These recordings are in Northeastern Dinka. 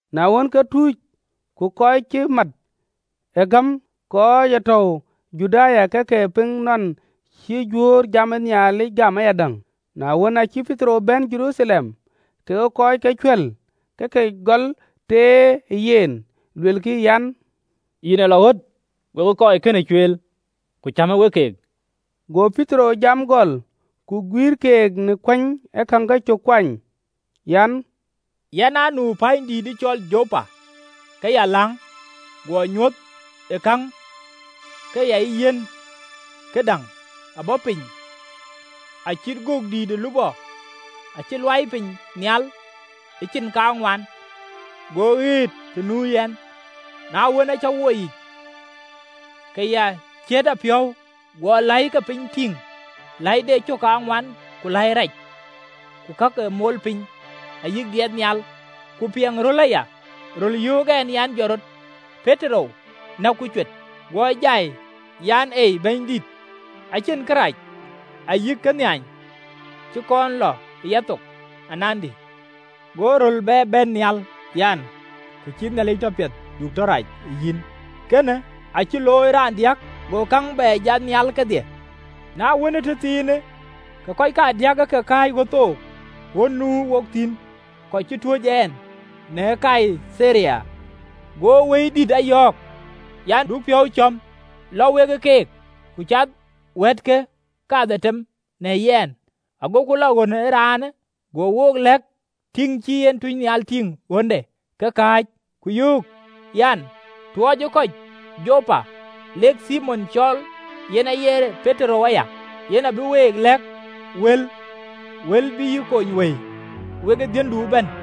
Na wën, ke tuuc ku kɔc cï mat ë gäm kɔc ë tɔ̈u ë Juda ke ke piŋ nɔn cï Juöör jam ë Nhialic gam ayadäŋ. Na wën, aa cï Petero bɛ̈n Jeruthalem, ke kɔc ke cuɛ̈l ke ke gɔl teer ë yen, luelkï an, “Yïn ë lɔ ɣöt wekë kɔc kënë cueel, ku cämë we keek!” Go Petero jam gɔl, ku guïïr keek në kuëny ee käŋ kecök kuany an: “Yɛn aa nu pänydït cɔl Jopa ke ya läŋ. Guɔ nyuöth ë käŋ ke ya yiɛ̈n, këdäŋ aa bɔ̈ piny acït gök dïït ë lupɔ acï luaai piny nhial ë cin kaŋuan, go ɣëët të nuö yɛn. Na wën, aa cä woi yic, ke ya ciët apiɔ̈u, guɔ läi ke piny tïŋ, läi de cök kaŋuan, ku läi rac, ku kak ee mol piny, ayï diɛt nhial. Ku piɛŋ röl aya, röl yöök ɛn an, ‘Jɔt rɔt, Petero, näk ku cuet.’ Guɔ jai an, ‘Ei, Bɛ̈nydït, acïn kërac ayï kënhiany cï kɔn lɔ ë yathok anandï.’ Go röl bɛ bɛ̈n nhial, an, ‘Kë cïï Nhialic tɔ piɛth, du tɔ rac, yïn.’ Kënë acï looi raandiäk: go käŋ bɛ jat nhial kedhie. Na wën, ëtëthiinë, ka kɔc kadiäk ë ke kääc ɣöt thok ɣön nu wok thïn, kɔc cï tuöc ɛn në Kaitharia. Go Wëidït a yɔ̈ɔ̈k, an, du piɔ̈u cɔ̈m, lɔ we keek. Ku cath wɛ̈ɛ̈tkë kadhetem në yɛn, agoku lɔ ɣön ee raanë. Go wook lɛ̈k tïŋ cï en tunynhial tïŋ ɣönde ke kääc, ku yöök an, ‘Tuɔɔcë kɔc Jopa lek Thimon cɔɔl, yen aye Petero aya. Yen abï week lɛ̈k wël, wël bï yï kony wëi wekë dhiëndu ëbɛ̈n.’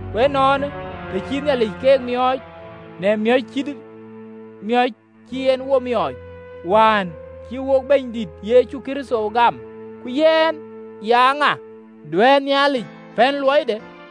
Ku ënɔɔnë, të cï Nhialic keek miɔɔc në miɔ̈c cït miɔ̈c cï en wo miɔɔc, wään cï wo Bɛ̈nydït Yecu Kërtho gam, ku yɛn, ya ŋa, duɛ̈ɛ̈r Nhialic pɛ̈n luɔide?”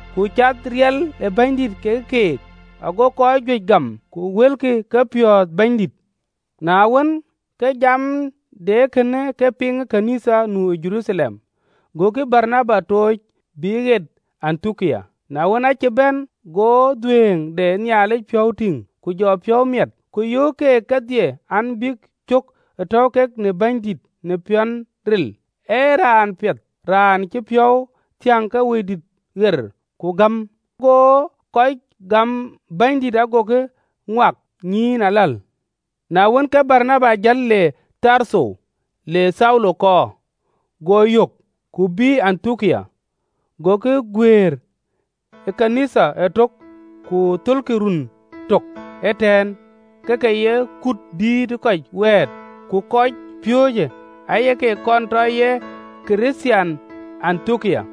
Ku cath riɛl ë Bɛ̈nydït ke keek, go kɔc juëc gam, ku wëlkï kepiɔ̈ɔ̈th Bɛ̈nydït. Na wën, ke jam de ee kënë ke piŋ në ɣön ë Nhialic nu ë Jeruthalem, gokï Baranaba tooc bï ɣet Antiokia. Na wën, aa cï bɛ̈n, ago dhuëëŋ de Nhialic piɔ̈u tïŋ, ke jɔ piɔ̈u miɛt, ku yöök keek kedhie an, bïk cök ë tɔ̈u kek në Bɛ̈nydït në piɔ̈n ril. Baranaba ee raan piɛth, raan cï piɔ̈u thiäŋ ke Wëidït ɣer ku gäm, go kɔc gam Bɛ̈nydït ago ke ŋuak nyïïn aläl. Na wën, ke Baranaba jël le Tartho, le Thaulo kɔɔr. Go yök, ku bïï Antiokia. Gokï aa guëër ɣön ë Nhialic ëtök ku thölkï ruöön tök ëtɛ̈ɛ̈n, ke ke ye kut dïït ë kɔc wɛ̈ɛ̈t. Ku kɔcpiööcë aake kɔnë tɔ ye Kërthiaan në Antiokia.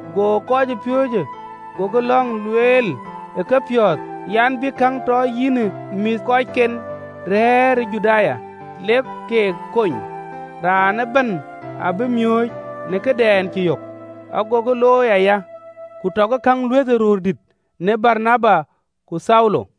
Go kɔcpiööcë gokï löŋ lueel ë kepiɔ̈ɔ̈th an, bïk käŋ tɔ yïnë mïthëkɔckɛn rɛ̈ɛ̈r ë Juda, lek keek kony, raan ëbɛ̈n abï miööc në këdɛn cï yök. Agokï looi aya, ku tɔkï käŋ luëthë röördït në Baranaba ku Thaulo.